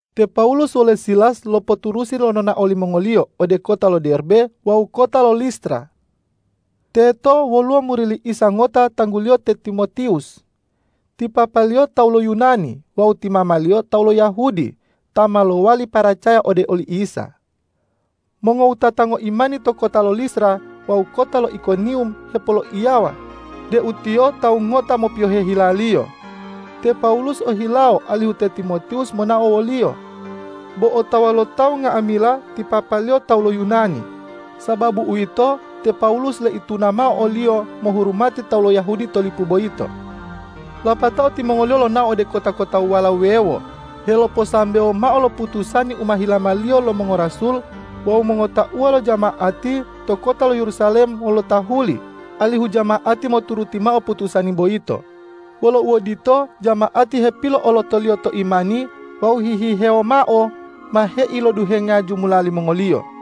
Te Pawulus wole Silas lopoturusi lo nonao limongoliyo ode kota lo Derbe wawu kota lo Listra. Teto woluwo muri li Isa ngota tangguliyo te Timotiwus. Ti papaliyo tawu lo Yunani wawu ti mamaliyo tawu lo Yahudi ta ma lowali paracaya ode oli Isa. Mongowutata ngoimani to kota lo Listra wawu kota lo Ikoniwum hepoloiyawa deu tiyo tawu ngota mopiyohe hilaliyo. Te Pawulus ohilawo alihu te Timotiwus monao woliyo. Bo otawa lo tawu nga'amila ti papaliyo tawu lo Yunani. Sababu uwito, te Pawulus loituna mao oliyo mohurumati tawu lo Yahudi to lipu boyito. Lapatao timongoliyo lonao ode kota-kotawala wuwewo heloposambewo mao lo putusani u ma hilamaliyo lo mongorasul wawu mongotauwa lo jama'ati to kota lo Yerusalem wolo tahuli, alihu jama'ati moturuti mao putusani boyito. Wolo uodito, jama'ati hepilo'olotoliyo to imani wawu hihihewo mao ma heiloduhenga jumula limongoliyo.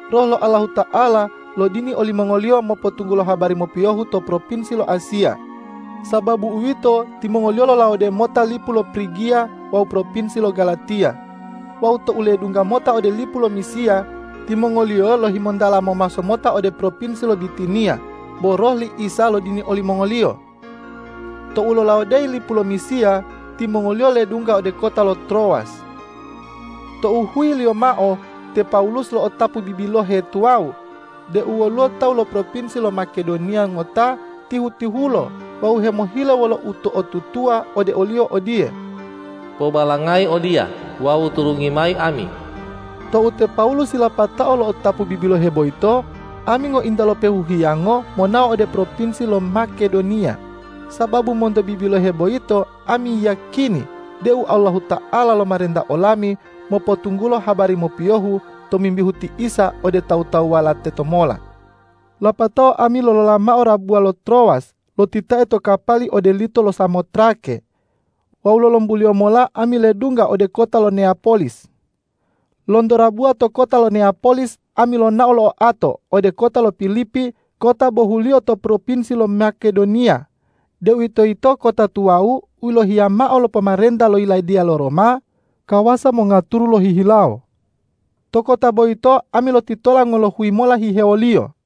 Roh lo Allahuta'ala lodini olimongoliyo mopotunggulo habari mopiyohu to propinsi lo Asiya. Sababu uwito, timongoliyo lolawode mota lipu lo Prigiya wawu propinsi lo Galatiya. Wawu tou ledungga mota ode lipu lo Misiya, timongoliyo lohimontala momaso mota ode propinsi lo Bitiniya, bo Roh li Isa lodini olimongoliyo. Tou lolawodeyi lipu lo Misiya, timongoliyo ledungga ode kota lo Trowas. Tou huyiliyo mao te Pawulus lo'otapu bibilohe tuwawu deu woluwo tawu lo propinsi lo Makedoniya ngota tihu-tihulo wawu hemohile wolo uto'otutuwa ode oliyo odiye,”Pobalangayi odiya wawu turungi mayi ami!” Tou te Pawulus yilapatao lo'otapu bibilohe boyito, ami ngointa lopehu hiyango monao ode propinsi lo Makedoniya, sababu monto bibilohe boyito ami yiyakini deu Allahuta'ala lomarenta olami mopotunggulo habari mopiyohu tomimbihu ti Isa ode tawu-tawuwala tetomola. Lapatao ami lolola mao rabuwa lo Trowas lotitae to kapali ode lito lo Samotrake wawu lolombuliyo mola ami ledungga ode kota lo Neyapolis. Lonto rabuwa to kota lo Neyapolis ami lonao lo oato ode kota lo Pilipi kota bohuliyo to propinsi lo Makedoniya, deuwitoyito kota tuwawu u yilohiya mao lo pomarenta lo yiladiya lo Roma kawasa mongaturu lohihilawo. To kota boyito ami lotitola ngolohuyi mola hihewoliyo.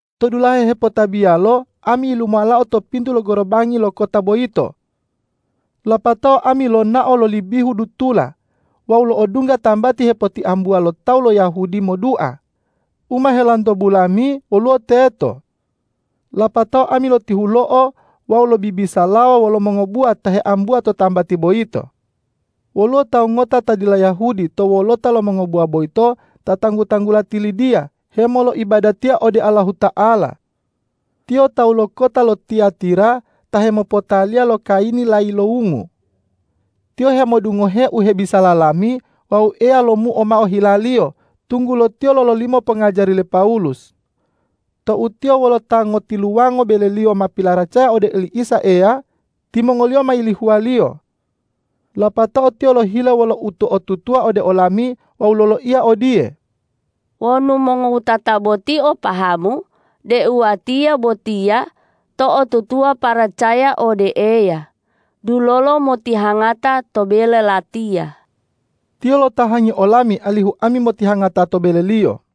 To dulahe hepotabiyalo ami yilumuwalao to pintu lo gorobangi lo kota boyito. Lapatao ami lonao loli bihu dutula wawu lo'odungga tambati hepotiambuwa lo tawu lo Yahudi modua, u ma helantobu lami woluwo teto. Lapatao ami lotihulo'o wawu lobibisalawa wolo mongobuwa ta heambuwa to tambati boyito. Woluwo tawu ngota ta dila Yahudi to wolota lo mongobuwa boyito ta tanggu-tanggula ti Lidiya hemoloibadatiya ode Allahuta'ala. Tiyo tawu lo kota lo Tiyatira ta hemopotaliya lo kayini layilowungu. Tiyo hemodungohe u hebisala lami wawu Eya lomuo mao hilaliyo, tunggulo tiyo lololimo pongajari le Pawulus. Tou tiyo wolo ta ngotiluwango beleliyo ma pilaracaya ode oli Isa Eya, timongoliyo ma yilihuwaliyo. Lapatao tiyo lohile wolo uto'otutuwa ode olami wawu loloiya odiye,”Wonu mongowutata boti o pahamu deu watiya botiya to'otutuwa paracaya ode Eya, dulolo motihangata to bele latiya.” Tiyo lotahangi olami alihu ami motihangata to beleliyo.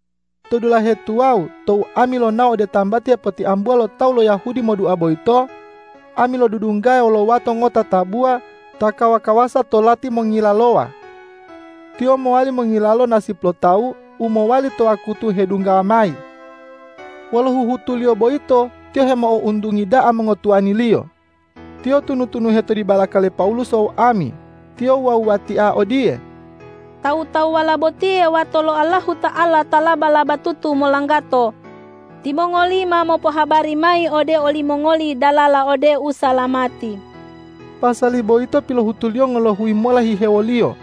To dulahe tuwawu tou ami lonao ode tambati hepotiambuwa lo tawu lo Yahudi modua boyito, ami lodudunggaya wolo wato ngota tabuwa ta kawa-kawasa to lati mongilalowa. Tiyo mowali mongilalo nasip lo tawu u mowali to wakutu hedunggawa mayi. Wolo huhutuliyo boyito tiyo hemo'ountungi da'a mongotuwaniliyo. Tiyo tunu-tunuhe to dibalaka le Pawulus wawu ami. Tiyo wuwa-wuwatia odiye,”Tawu-tawuwala botiye wato lo Allahuta'ala ta laba-labatutu molanggato. Timongoliyo ma mopohabari mayi ode olimongoli dalala ode usalamati.” Pasali boyito pilohutuliyo ngolohuyi mola hihewoliyo.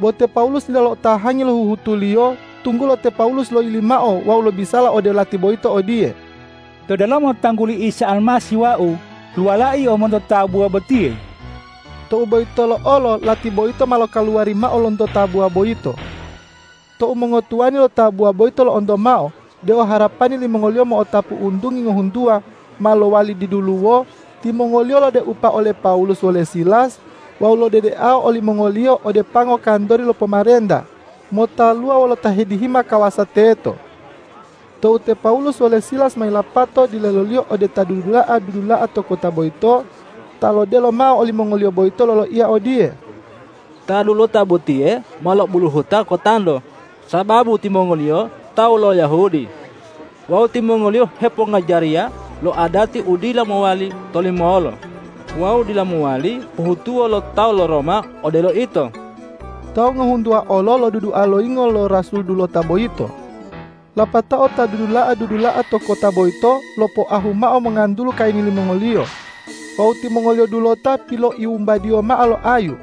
Bo te Pawulus dila lo'otahangi lo huhutuliyo, tunggulo te Pawulus loyili mao wawu lobisala ode lati boyito odiye,”To delomo tangguli Isa Almasih wau luwalao yio monto tabuwa botiye.” Tou boyitolo olo lati boyito ma lokaluwari mao lonto tabuwa boyito. Tou mongotuwani lo tabuwa boyito lo'onto mao deu harapani limongoliyo mo'otapu untungi ngohuntuwa ma lowali diduluwo, timongoliyo lodeupa ole Pawulus wole Silas wawu lodedeao olimongoliyo ode pango kantori lo pomarenta motaluwa wolo ta hedihima kawasa teto. Tou te Pawulus wole Silas ma yilapato dileloliyo ode ta dudula'a-dudula'a to kota boyito, ta lodelo mao olimongoliyo boyito loloiya odiye,”Ta dulota botiye ma lo'obuluhuta kotanto sababu timongoliyo tawu lo Yahudi wawu timongoliyo hepongajariya lo adati u dila mowali tolimolo wawu dila mowali pohutuwo lo tawu lo Roma odelo ito!” Tawu ngohuntuwa olo lodudua loyingo lo rasul dulota boyito. Lapatao ta dudula'a-dudula'a to kota boyito lopoahu mao mongantulu kayini limongoliyo wawu timongoliyo dulota piloiwumbadiyo mao lo ayu.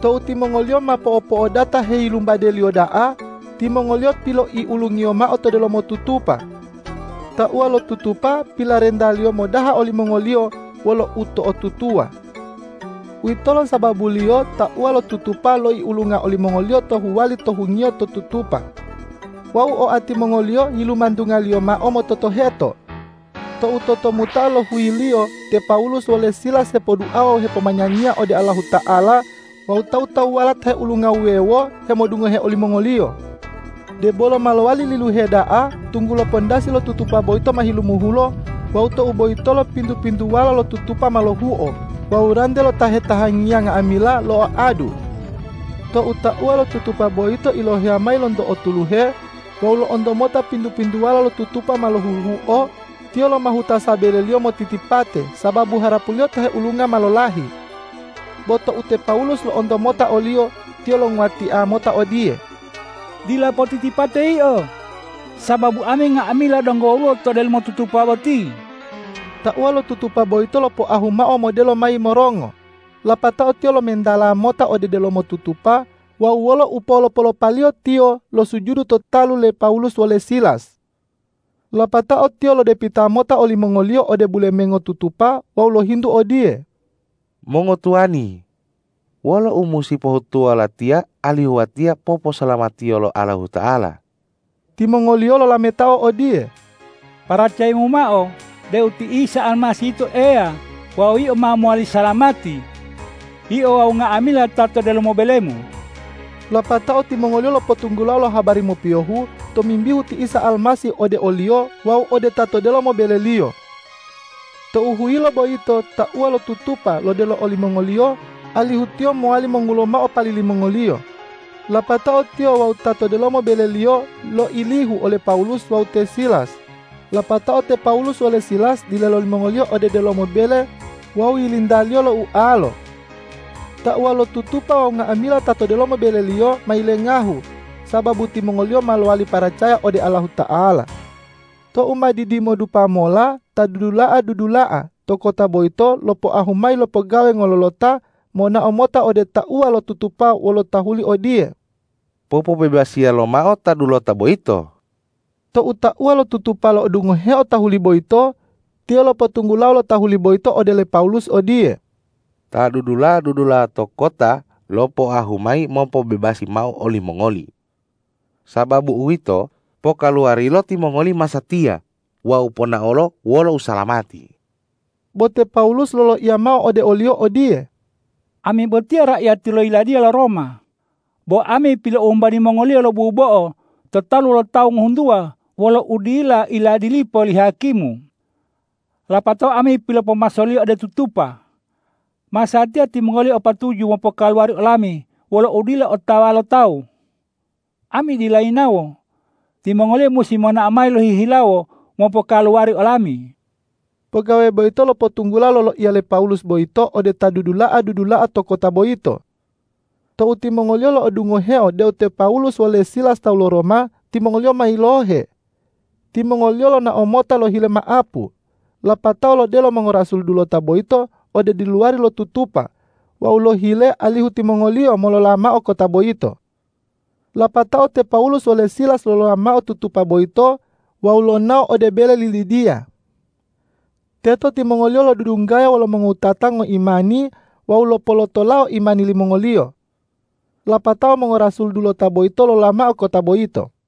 Tou timongoliyo ma po'opo'odata heyilumbadeliyo da'a, timongoliyo piloiulungiyo mao to delomo tutupa. Tauwa lo tutupa pilarentaliyo modaha olimongoliyo wolo uto'otutuwa. Uwitolo sababuliyo tauwa lo tutupa loiulunga olimongoliyo to huwali to hungiyo to tutupa wawu oati mongoliyo yilimantungaliyo mao mototoheto. Tou totomuta'a lo huyiliyo te Pawulus wole Silas hepoduawa wawu hepomanyanyiya ode Allahuta'ala wawu tawu-tawuwala ta heulunga wuwewo hemodungohe olimongoliyo. Debolo ma lowali liluhe da'a, tunggulo pandasi lo tutupa boyito ma hilumuhulo, wawu tou boyitolo pintu-pintuwala lo tutupa ma lohuhuo wawu rante lo ta hetahangiya nga'amila lo'oadu. Tou tauwa lo tutupa boyito iloheya mayi lonto otuluhe wawu lo'onto mota pintu-pintuwala lo tutupa ma lohuhuo, tiyo lomahuta sabeleliyo motitipate, sababu harapuliyo ta heulunga ma lolahi. Bo tou te Pawulus lo'onto mota oliyo, tiyo longuwatia mota odiye,”Dila potitipate yio, sababu ami nga'amila donggo woluwo to delomo tutupa boti!” Tauwa lo tutupa boyito lopoahu mao modelo mayi morongo, lapatao tiyo lomentala mota ode delomo tutupa wawu wolo upolo-polopaliyo tiyo losujudu to talu le Pawulus wole Silas. Lapatao tiyo lodepita mota olimongoliyo ode bulemengo tutupa wawu lohintu odiye,”Mongotuwani, wolo u musi pohutuwo latiya alihu watiya poposalamatiyo lo Allahuta'ala?” Timongoliyo lolametao odiye,”Paracayayimu mao deu ti Isa Almasih yito Eya wawu yio ma mowali salamati, yio wawu nga'amila ta to delomo belemu.” Lapatao timongoliyo lopotunggulao lo habari mopiyohu tomimbihu ti Isa Almasih ode oliyo wawu ode ta to delomo beleliyo. Tou huyilo boyito tauwa lo tutupa lodelo olimongoliyo, alihu tiyo mowali mongulo mao pali limongoliyo. Lapatao tiyo wawu ta to delomo beleliyo loilihu ole Pawulus wawu te Silas. Lapatao te Pawulus wole Silas dilelo limongoliyo ode delomo bele wawu yilintaliyo lo ualo. Tauwa lo tutupa wawu nga'amila ta to delomo beleliyo ma yilengahu, sababu timongoliyo ma lowali paracaya ode Allahuta'ala. Tou ma didimodupa mola ta dudula'a-dudula'a to kota boyito lopoahu mayi lo pogawe ngololota monao mota ode tauwa lo tutupa wolo tahuli odiye,”Popobebasiya lomao ta dulota boyito!” Tou tauwa lo tutupa lo'odungoheo tahuli boyito, tiyo lopotunggulao lo tahuli boyito ode le Pawulus odiye,”Ta dudula'a-dudula'a to kota lopoahu mayi mopobebasi mao olimongoli. Sababu uwito, pokaluwarilo timongoli masatiya wawu ponaolo wolo usalamati!” Bo te Pawulus loloiya mao ode oliyo odiye,”Ami botiya raiyati lo yiladiya lo Roma. Bo ami piloiwumbadi mongoliyo lo bubo'o to talu lo tawu ngohuntuwa wolo udila iladilipo li hakimu. Lapatao ami pilopomasoliyo ode tutupa. Masatiya timongoliyo o patuju mopokaluwari olami wolo udila otawa lo tawu. Ami dila yinawo. Timongoliyo musi monao mayi lohihilawo mopokaluwari olami.” Pogawe boyito lopotunggulao loloiya le Pawulus boyito ode ta dudula'a-dudula'a to kota boyito. Tou timongoliyo lo'odungoheo deu te Pawulus wole Silas tawu lo Roma, timongoliyo ma yilohe. Timongoliyo lonao mota lohile ma'apu, lapatao lodelo mongorasul dulota boyito ode diluwari lo tutupa wawu lohile alihu timongoliyo molola mao kota boyito. Lapatao te Pawulus wole Silas lolola mao tutupa boyito wawu lonao ode bele li Lidiya. Teto timongoliyo lodudunggaya wolo mongowutata ngoimani wawu lopolotolao imani limongoliyo. Lapatao mongorasul dulota boyito lolola mao kota boyito.